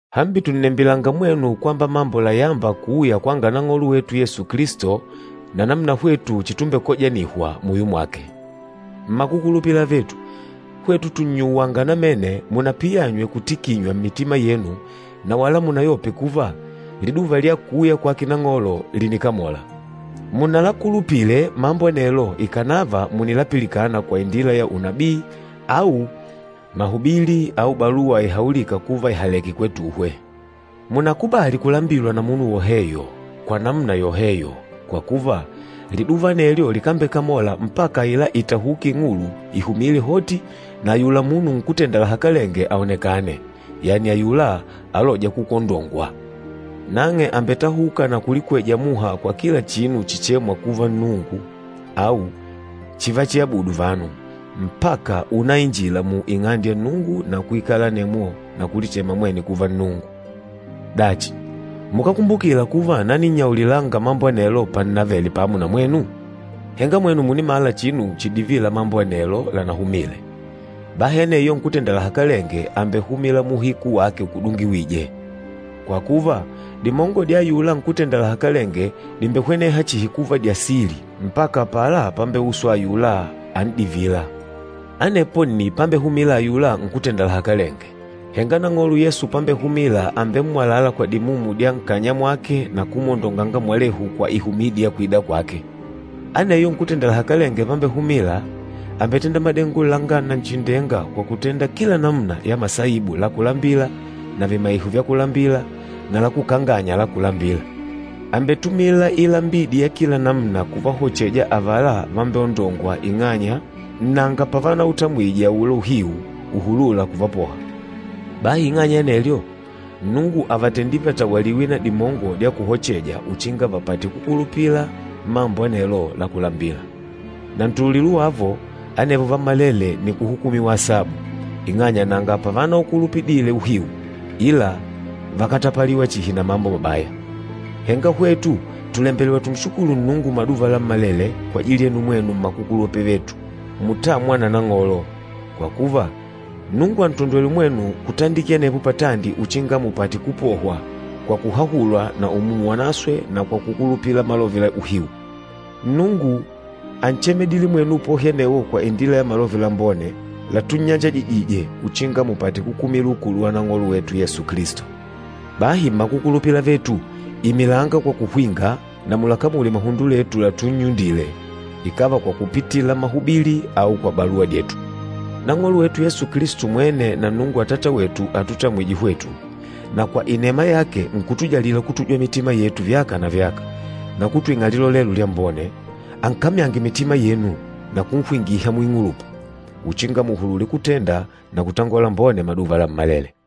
Hambi tùnnembilanga mwenu kwamba mambo layâmba kuuya kwa Nang'olo wetu Yesu Kilisto na namuna hwetu chitumbekojanihwa muyo mwake. Mmakukulupila avetu, hwetu tùnannyuwanga namene, munapiyanywe kutikinywa mmitima yenu na wala munayope kuva, liduva lya kuuya kwake Nang'olo lìnikamola. Munalakulupile mambo anelo ikànava mùnilapilikana kwa indila ya unabii au mahubili au baluwa ihaulîka kuva ìhaleke kwetuhwe. Munákubali kulambilwa na munu woheyo kwa namuna yoheyo. Kwa kuva, Liduva anelyo likambekamola mpaka aila itahuki ing'ulu ihumìlè hoti na ayula munu nkútenda lahakalenge aonekane, yani ayula alôja kukwondongwa. Nang'e àmbetahuka na kulikweja muha mwa kila chinu chichêmwa kuva Nnungu au chivachiabudu vanu, mpaka únainjila mu Ing'ande ya Nnungu na kuikala anemwo na kulichema mwene kuva Nnungu. Dachi, mukákumbukila kuva naninnyaulilanga mambo anelo pannavele pamo na mwenu? Henga mwenu mùnimala chinu chidivîla mambo anelo lanahumììle. Bahi aneyo nkútenda lahakalenge àmbehumila muuhiku wake ukudungiwîje. Kwa kuva, dimongo dya ayula nkútenda lahakalenge dìmbehweneha chihi kuva dya sili mpaka apala pambeuswa ayula an'divîla. Anepo nni pambehumila ayula nkútenda lahakalenge, henga Nang'olo Yesu pambehumila àmbemmwalala kwa dimumu dya nkanya mwake na kumwondonganga mwalehu kwa ihumidi ya kwida kwake. Aneyo nkútenda lahakalenge pambehumila, àmbetenda madengo langa Nanchindenga kwa kutenda kila namuna ya masaibu la kulambila na vimaiho vya kulambila na lakukanganya la kulambila. Àmbetumila ilambidi ya kila namuna kuvahocheja avala vambeondôngwa ing'anya nanga pavanautamwije aula uhiu uhulûla kuvapoha. Bahi ing'anya ya anelyo, Nnungu àvatendile vatawaliwe na dimongo dya kuhocheja uchinga vapate kukulupila mambo anelo la kulambila. Na ntululilo wavo, anevo vammalele nni kuhukumiwa asabu, ing'anya nanga pavanaukulupidile uhiu, ila vákatapaliwa chihi na mambo mabaya. Henga hwetu tùlembelewa tunshukulu Nnungu maduva lammalele kwajili yenu mwenu mmakukulupila avetu mutâmwa na Nang'olo. Kwa kuva, Nnungu àntondwele mwenu kutandikila anepo patandi uchinga mupate kupohwa kwa kuhahulwa na Umumu Wanaswe na kwa kukulupila malove la uhiu. Nnungu ánchemedile mwenu upohi anewo kwa indila ya Malove Lambone latunnyanjajijije uchinga mupate kukumila ukulu wa Nang'olo wetu Yesu Kilisto. Bahi mmakukulupila avetu, imilanga kwa kuhwinga na mulakamule muhundo letu latunnyundile, ikàva kwa kupitila mahubili au kwa baluwa dyetu. Nang'olo wetu Yesu Kilisto mwene na Nnungu Atata wetu atutamwîje hwetu, na kwa inema yake nkutujalila kutujwa mitima yetu vyaka na vyaka, na kutwing'a lilolelo lyambone, ankamyange mitima yenu na kunhwingiha muing'ulupa, uchinga muhulule kutenda na kutangola lambone maduva lammalele.